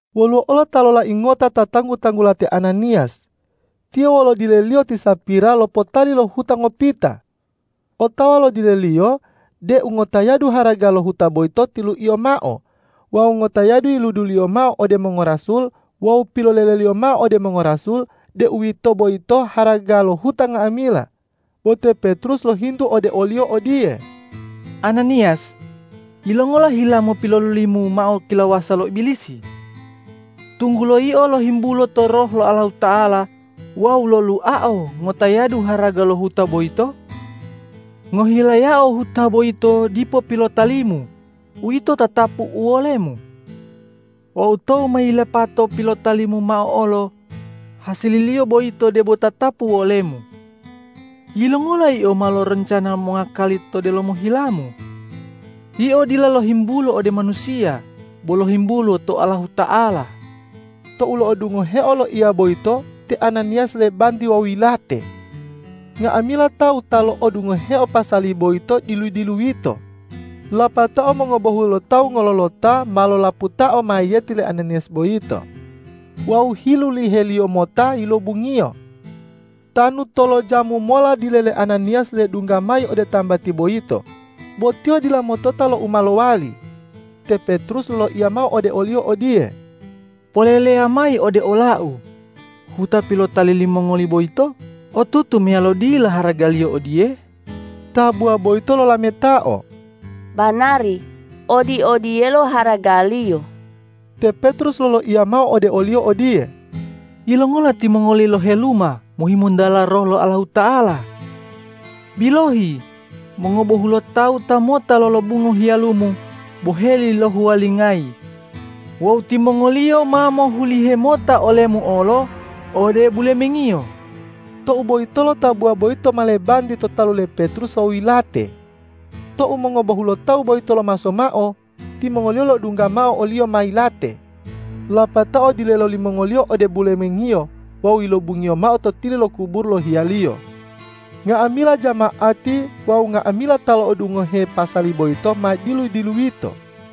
Woluwo olo ta lolai ngota ta tanggu-tanggula te Ananiyas. Tiyo wolo dileliyo ti Sapira lopotali lo huta ngopita. Otawa lo dileliyo deu ngotayadu haraga lo huta boyito tiluiyo mao wawu ngotayadu yiluduliyo mao ode mongorasul wawu piloleleliyo mao ode mongorasul deu uwito boyito haraga lo huta nga'amila. Bo te Petrus lohintu ode oliyo odiye,”Ananiyas, yilongola hilamu pilolulimu mao kilawasa lo Ibilisi, tunggulo yio lohimbulo to Roh lo Allahuta'ala wawu loluao ngotayadu haraga lo huta boyito? Ngohilayao huta boyito dipo pilotalimu, uwito tatapu uwolemu; wawu tou ma yilapato pilotalimu mao olo, hasililiyo boyito debo tatapu uwolemu. Yilongola yio ma loroncana mongakali to delomo hilamu? Yio dila lohimbulo ode manusiya, bo lohimbulo to Allahuta'ala!” Tou lo'odungoheo loiya boyito, te Ananiyas lebanti wawu yilate. Nga'amila tawu ta lo'odungohe pasali boyito dilu-diluyito. Lapatao mongobohulotawu ngololota ma lolaputao mayiyeti le Ananiyas boyito wawu hiluliheliyo mota yilobungiyo. Tanu tolojamu mola dile le Ananiyas ledungga mayi ode tambati boyito, bo tiyo dila motota lo u ma lowali. Te Petrus loloiya mao ode oliyo odiye,”Poleleya mayi ode olau, huta pilotali limongoli boyito otutu meyalo dila haragaliyo odiye?” Tabuwa boyito lolametao,”Banari odi-odiyelo haragaliyo.” Te Petrus loloiya mao ode oliyo odiye,”Yilongola timongoli loheluma mohimontala Roh lo Allahuta'ala? Bilohi, mongobohulotawu ta mota lolobunga hiyalumu boheli lohuwalingayi wawu timongoliyo ma mohulihe mota olemu olo ode bulemengiyo.” Tou boyitolo tabuwa boyito ma lebanti to talu le Petrus wawu yilate. Tou mongobohulotawu boyito lomaso mao, timongoliyo lo'odungga mao oliyo ma yilate, lapatao dilelo limongoliyo ode bulemengiyo wawu yilobungiyo mao to tili lo kuburu lo hiyaliyo. Nga'amila jama'ati wawu nga'amila ta lo'odungohe pasali boyito ma dilu-diluyito.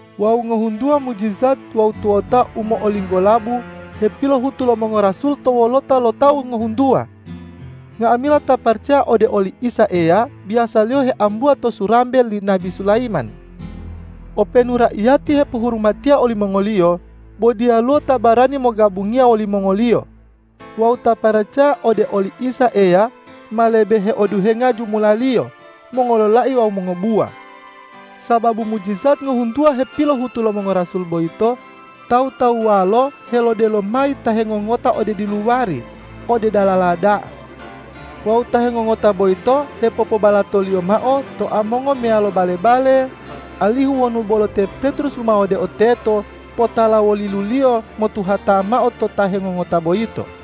Wawu ngohuntuwa mujijat wawu tuwota u mo'olinggolabu hepilohutu lo mongorasul to wolota lo tawu ngohuntuwa. Nga'amila ta paracaya ode oli Isa Eya biyasaliyo heambuwa to Surambe li Nabi Sulayiman. Openu raiyati hepohurumatiya olimongoliyo, bo diyaluwo ta barani mogabungiya wolimongoliyo. Wawu ta paracaya ode oli Isa Eya ma lebe heoduhenga jumulaliyo, mongololai wawu mongobuwa. Sababu mujijat ngohuntuwa hepilohutu lo mongorasul boyito, tawu-tawuwalo helodelo mayi ta hengongota ode diluwari, ode dalala da'a. Wawu ta hengongota boiyto hepopobalatoliyo mao to amongo meyalo bale-bale, alihu wonu bolo te Petrus lumawodeo teto, potala woliluliyo metuhata mao to ta hengongota boyito.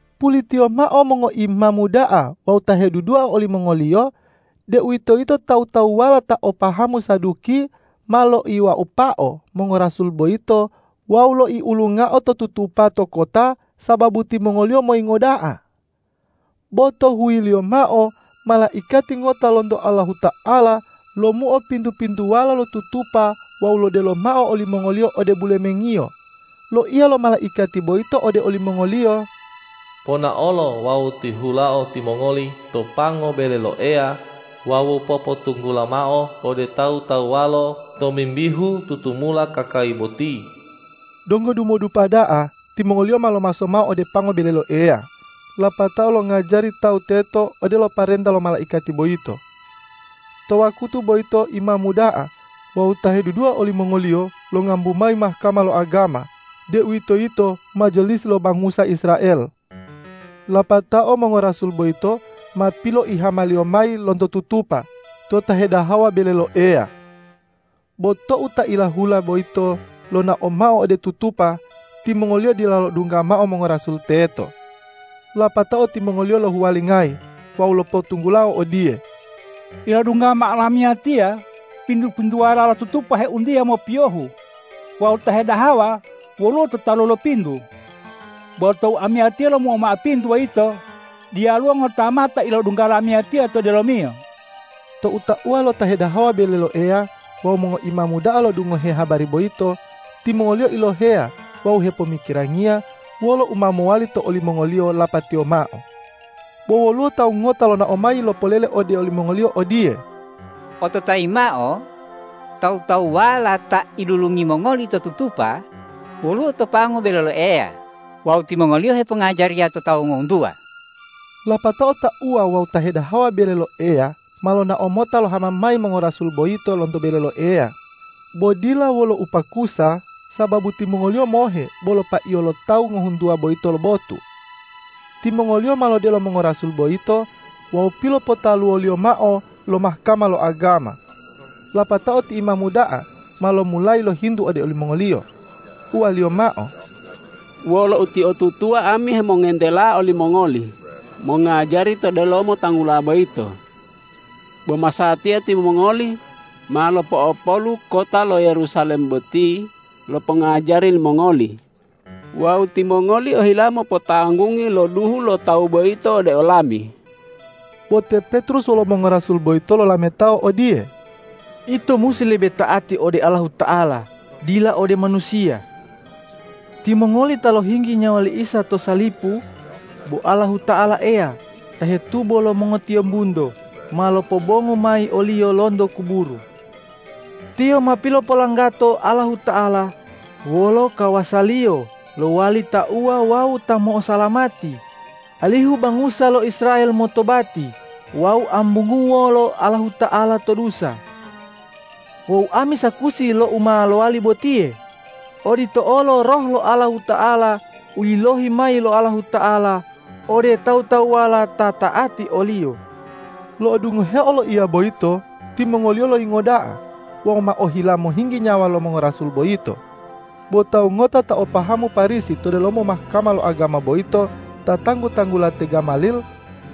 Pulitiyo mao mongoimamu da'a wawu ta hedudua olimongoliyo, deuwitoyito tawu-tawuwala ta o pahamu Saduki, ma loiwaupao mongorasul boyito wawu loiulungao to tutupa to kota sababu timongoliyo moyingo da'a. Bo to huyiliyo mao malaikati ngota lonto Allahuta'ala lomuo pintu-pintuwala lo tutupa wawu lodelo mao olimongoliyo ode bulemengiyo. Loiya lo malaikati boyito ode olimongoliyo, ”Ponaolo wawu tihulao timongoli to pango bele lo Eya wawu popotunggula mao ode tawu-tawuwalo tomimbihu tutumula kakali boti.” Donggo dumodupa da'a timongoliyo ma lomaso mao ode pango bele lo Eya lapatao longajari tawu teto odelo parenta lo malaikati boyito. To wakutu boyito imamu da'a wawu ta hedudua olimongoliyo longambu mayi Mahkama lo agama, deuwitoyito majalisi lo bangusa Israel. Lapatao mongorasul boyito ma piloihamaliyo mayi lonto tutupa to ta hedahawa bele lo Eya. Bo tou ta ilahula boyito lonao mao ode tutupa, timongoliyo dila lo'odungga mao mongorasul teto. Lapatao timongoliyo lohuwalingayi wawu lopotunggulao odiye, ”Ilodungga mao lamiyatiya pintu-pintuwala lo tutupa heuntiya mopiyohu wawu ta hedahawa woluwo to talu lo pintu. Bo tou amiyatiya lomuo mao pintu boyito, diyaluwo ngota mao ta ilodungga lamiyatiya to delomiyo.” Tou tauwa lo ta hedahawa bele lo Eya wawu mongoimamu da'a lo'odungohe habari boyito, timongoliyo iloheya wawu hepomikirangiya wolo u ma mowali to olimongoliyo lapatiyo mao. Bo woluwo tawu ngota lonao mayi lopolele ode olimongoliyo odiye,”Ototayi mao: Tawu-tawuwala ta ilulungi mongoli to tutupa, woluwo to pango bele lo Eya wawu timongoliyo hepongajariya to tawu ngohuntuwa!” Lapatao tauwa wawu ta hedahawa bele lo Eya ma lonao mota lohama mayi mongorasul boyito lonto bele lo Eya, bo dila wolo upakusa, sababu timongoliyo mohe bolo paiyo lo tawu ngohuntuwa boyito lo botu. Timongoliyo ma lodelo mongorasul boyito wawu pilopotaluwoliyo mao lo Mahkama lo agama. Lapatao ti imamu da'a ma lomulayi lohintu ode olimongoliyo, uwaliyo mao,”Wolo utiotutuwa ami hemongentela olimongoli mongajari to delomo Tanggula boyito. Bo masatiya timongoli ma lopo'opolu kota lo Yerusalem boti lo pongajari limongoli wawu timongoli ohila mopotanggungi lo duhu lo Tawu boyito ode olami.” Bo te Petrus wolo mongorasul boyito lolametao odiye,”Ito musi lebe ta'ati ode Allahuta'ala dila ode manusiya. Timongoli ta lohinggi nyawa li Isa to salipu, bo Allahuta'ala Eya ta hetubo lo mongotiyombunto ma lopobongu mayi o-Liyo lonto kuburu. Tiyo ma pilopolanggato Allahuta'ala wolo kawasa-Liyo lowali Tauwa wawu Ta mo'osalamati, alihu bangusa lo Israel motobati wawu ambunguwo lo Allahuta'ala to dusa. Wawu ami sakusi lo u ma lowali botiye, odito olo Roh lo Allahuta'ala u yilohi mayi lo Allahuta'ala ode tawu-tawuwala ta ta'ati o-Liyo.” Lo'odungoheo loiya boyito, timongoliyo loyingo da'a wawu ma ohila mohinggi nyawa lo mongorasul boyito. Bo tawu ngota ta o pahamu Parisi to delomo Mahkama lo agama boyito, ta tanggu-tanggula te Gamalil,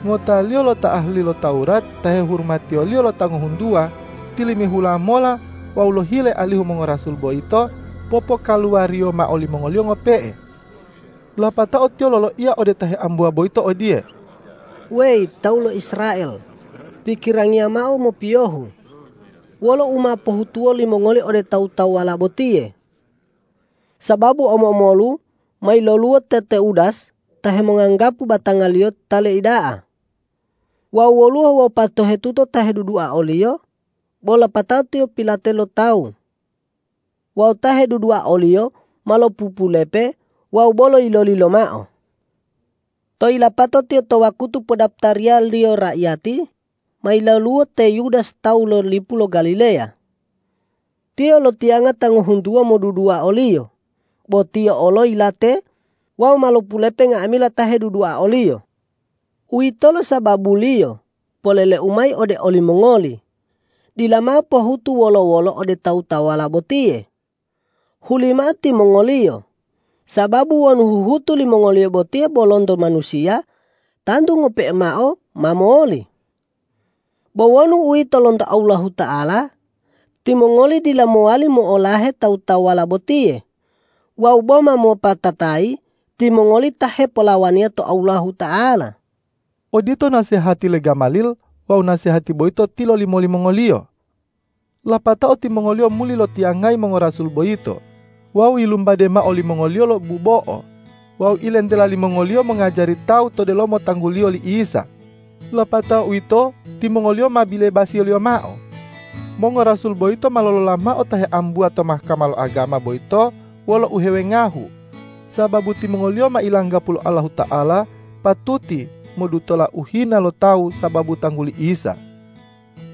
ngotaliyo lo ta ahali lo Tawurat ta hehurumatiyo lo tawu ngohuntuwa, tilimihula mola wawu lohile alihu mongorasul boyito popokaluwariyo mao limongoliyo ngope'e. Lapatao tiyo loloiya ode ta heambuwa boyito odiye,”Weyi tawu lo Israel, pikirangiya mao mopiyohu, wolo u ma pohutuwo limongoli ode tawu-tawuwala botiye! Sababu omo-omolu ma yiloluwo te Teudas ta hemonganggapu batangaliyo ta leida'a wawu woluwo wopatohetuto ta hedudua oliyo, bo lapatao tiyo pilate lo tawu wawu ta hedudua oliyo ma lopupulepe wawu bolo yiloli lomao. Tou yilapatao tiyo to wakutu podaputariyaliyo raiyati, ma yiloluwo te Yudas tawu lo lipu lo Galileya. Tiyo lotiyanga ta ngohuntuwa modudua oliyo, bo tiyo olo yilate wawu ma lopulepe nga'amila ta hedudua oliyo. Uwitolo sababuliyo poleleu mayi ode olimongoli, dila mao pohutu wolo-wolo ode tawu-tawuwala botiye. Hulimao timongoliyo, sababu wonu huhutu limongoliyo botiye bo lonto manusiya, tantu ngope'e mao ma moli. Bo wonu uwito lonto Allahuta'ala, timongoli dila mowali mo'olahe tawu-tawuwala botiye wawu boma mopatatayi timongoli ta hepolawaniya to Allahuta'ala.” Odito nasehati le Gamalil wawu nasehati boyito tilolimo limongoliyo. Lapatao timongoliyo muli lotiyangayi mongorasul boyito, wawu yilumbade mao limongoliyo lo bubo'o wawu ilentela limongoliyo mongajari tawu to delomo tangguliyo li Isa. Lapatao uwito timongoliyo ma bilebasiyaliyo mao. Mongorasul boyito ma lolola mao ta heambuwa to Mahkama lo agama boyito wolo uhewengahu, sababu timongoliyo ma ilanggapu lo Allahuta'ala patuti modutola uhina lo tawu sababu tangguli Isa.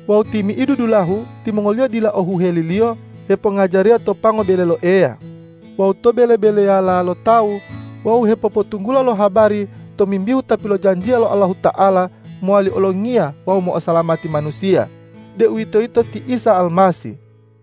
Wawu timi'idu dulahu timongoliyo dila o huheliliyo hepongajariya to pango bele lo Eya wawu to bele-beleyala lo tawu wawu hepopotunggula lo habari tomimbihu Ta pilojanjiya lo Allahuta'ala mowali Olongiya wawu mo'osalamati manusiya, deuwitoyito ti Isa Almasih.